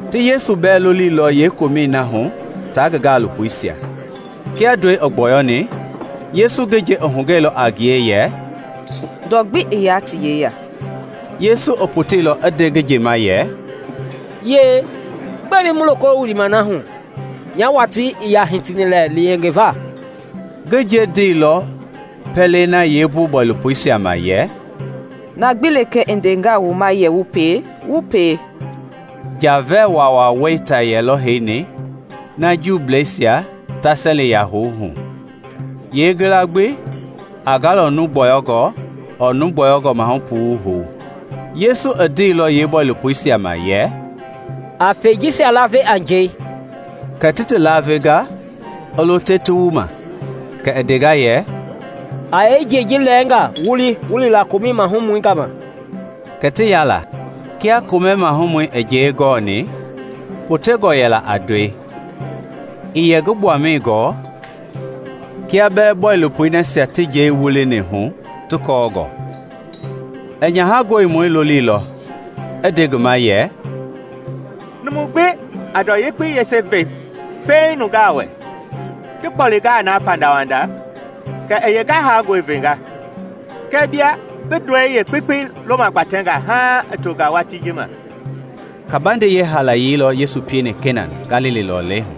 Ti Yesu bɛɛ loliilɔ yeekomɛi na hu tia ngi gaalopoisia. Kia ndɔi i gbɔyɔni, Yesu ngi nje i hugɛilɔ a ngie yɛ, “Ndɔ gbi ii yaa ti yeya.” Yesu i poteilɔ i nde ngi nje ma yɛ, “Yie, gbɛe bi mu loko wilima na hu? Nya watii ii yaa hitini lɛ yengeva.” Ngi nje ndeilɔ pɛlei na yeebɔilopoisia ma yɛ, “Na gbi lekee i ndengaa wu ma yɛ wu pie, wu pie.” Nja-vɛɛ waawaa wɛita yɛlɔ heini na Juuisia jɛli-yɛi houva hu, yeengila gbi a galɔŋ numu gbɔyɔngɔ ɔɔ numu gbɔyɔngɔ maahu puu hou. Yesu i ndeilɔ yeebɔilopoisia ma yɛ, “A fɛi jisia laave a njɛi.” Kɛ ti ti lavenga a lo te ti wu ma. Kɛ i ndenga yɛ, “A yee njɛi ji lɛɛnga wuli wu li la komɛ mahumɔi gama.” Kɛ ti ya la. Kia komɛi maahumɔi i njɛi gɔni, potengɔ yɛla na a ndɔi. Ii yɛ ngi gbuama gɔɔ kia bɛɛ bɔilopoi nasia ti njɛi wulini hu ti kɔɔngɔ. I nyaha gɔlimɔi loliilɔ i nde ngi ma yɛ, “Numu gbi a ndɔ yekpei yese pɛiŋ ve nungaa wɛ; ti kpolingaa na pandawanda, kɛ i yeengahangɔi venga; kɛɛ bia bi ndɔi yeekpekpei loomagbatɛnga haaŋ i tonga watii ji ma.” Kabandei yeehaalaye lɔ Yesu pieni Kena, Galili lɔlei hu;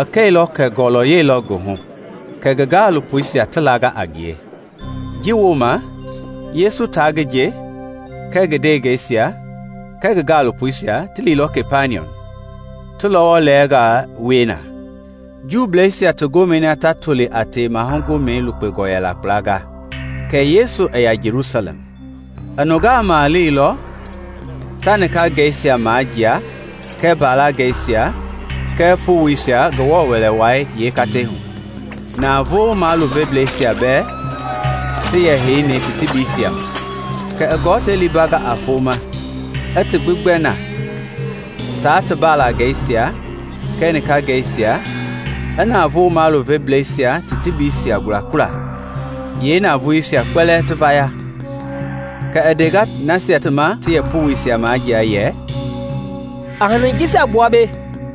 i kɛilɔ kɛ ngɔlɔyɛi lɔ ngi hu, kɛ ngi gaalopoisia ti langa a ngie. Ji wooma Yesu tia ngi nje kɛɛ ngi ndewengeisia kɛɛ ngi gaalopoisia ti liilɔ Kapaniɔm, ti lɔwɔ lɛnga wie na. Juuisia ti gomɛi na ta toli a Tewema Gomɛi lukpengɔ yɛla kpla kɛ Yesu i ya Jelusalɛm. I nungaa maleilɔ ta nikangɛisia majia kɛɛ mbalangɛisia kɛɛ powoisia Ngewɔ Wɛlei yeekatei hu, navoo maluveblɛisia bɛɛ ti heini ti tebiisia ma. Kɛ i gɔtei liimbanga a foma, i ti gbi gbɛ na tia mbalangɛisia kɛɛ nikangɛisia, i navoo maluveblɛisia ti tebiisia gulagula, yeenavoei kpɛlɛɛ i vaya. Kɛ i ndenga nasia ma ti yɛ powoisia majia yɛ, “A hanii jisia gbua mbei;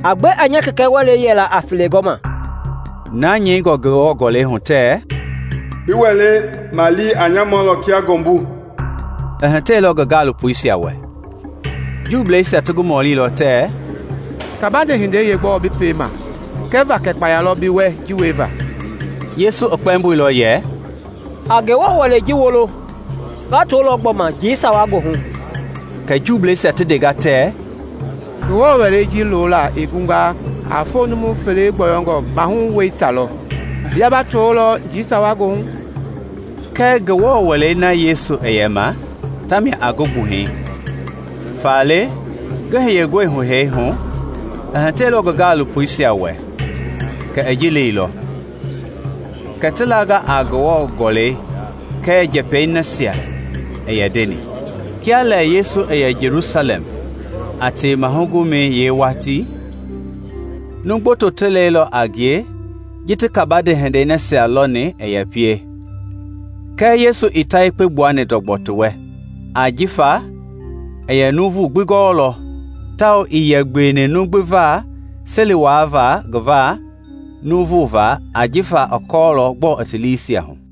a gbe a nya Kɛkɛ Wɛlei yɛlaa a felegɔma.” Na nyɛingɔ Ngewɔ Gɔlɛi hu tɛɛ, “Bi Wɛlei malii a nya mɔlɔ kia ngɔmbu” i hitɛilɔ ngi gaalopoisia wɛ. Juuisia ti ngi mɔlilɔ tɛɛ, “Kabande hindei yeegbɔɔ bi piema kɛva kɛ kpaya lɔ bi wɛ ji wieva?” Yesu i kpɛmboilɔ yɛ, “A Ngewɔ Wɛlei ji wolo; nga tolɔ gbɔma njii sawa goohu.” Kɛ Juuisia ti ndenga tɛɛ, “Ngewɔ Wɛlei ji lola i gunga a foo numu fele gbɔyɔngɔ maahu wɛita lɔ; bia ba tolɔ njii sawa goohu?” Kɛɛ Ngewɔ Wɛlei na Yesu i yɛ ma tamia a ngi gbuhɛi. Faale ngi hiyengɔi hu hee hu, i hitɛilɔ ngi gaalopoisia wɛ kɛ i ji leilɔ; kɛ ti langa a Ngewɔ Gɔlɛi kɛɛ njɛpɛi nasia i yɛ ndeni. Kia lɛ Yesu i yɛ Jelusalɛm a Tewema Gomɛi yeewatii, numu gboto ti lɛilɔ a ngie ji ti kabande hindei nasia lɔni i yɛ pie; kɛɛ Yesu ii ta yekpe gbuani ndɔgbɔ ti wɛ, ajifa i yɛ nuuvu gbi gɔɔlɔ, tawao ii yɛ gbeweni numu gbi va seli wuava nuuvui va ajifa i kɔɔlɔ gbɔɔ i ti liisia hu.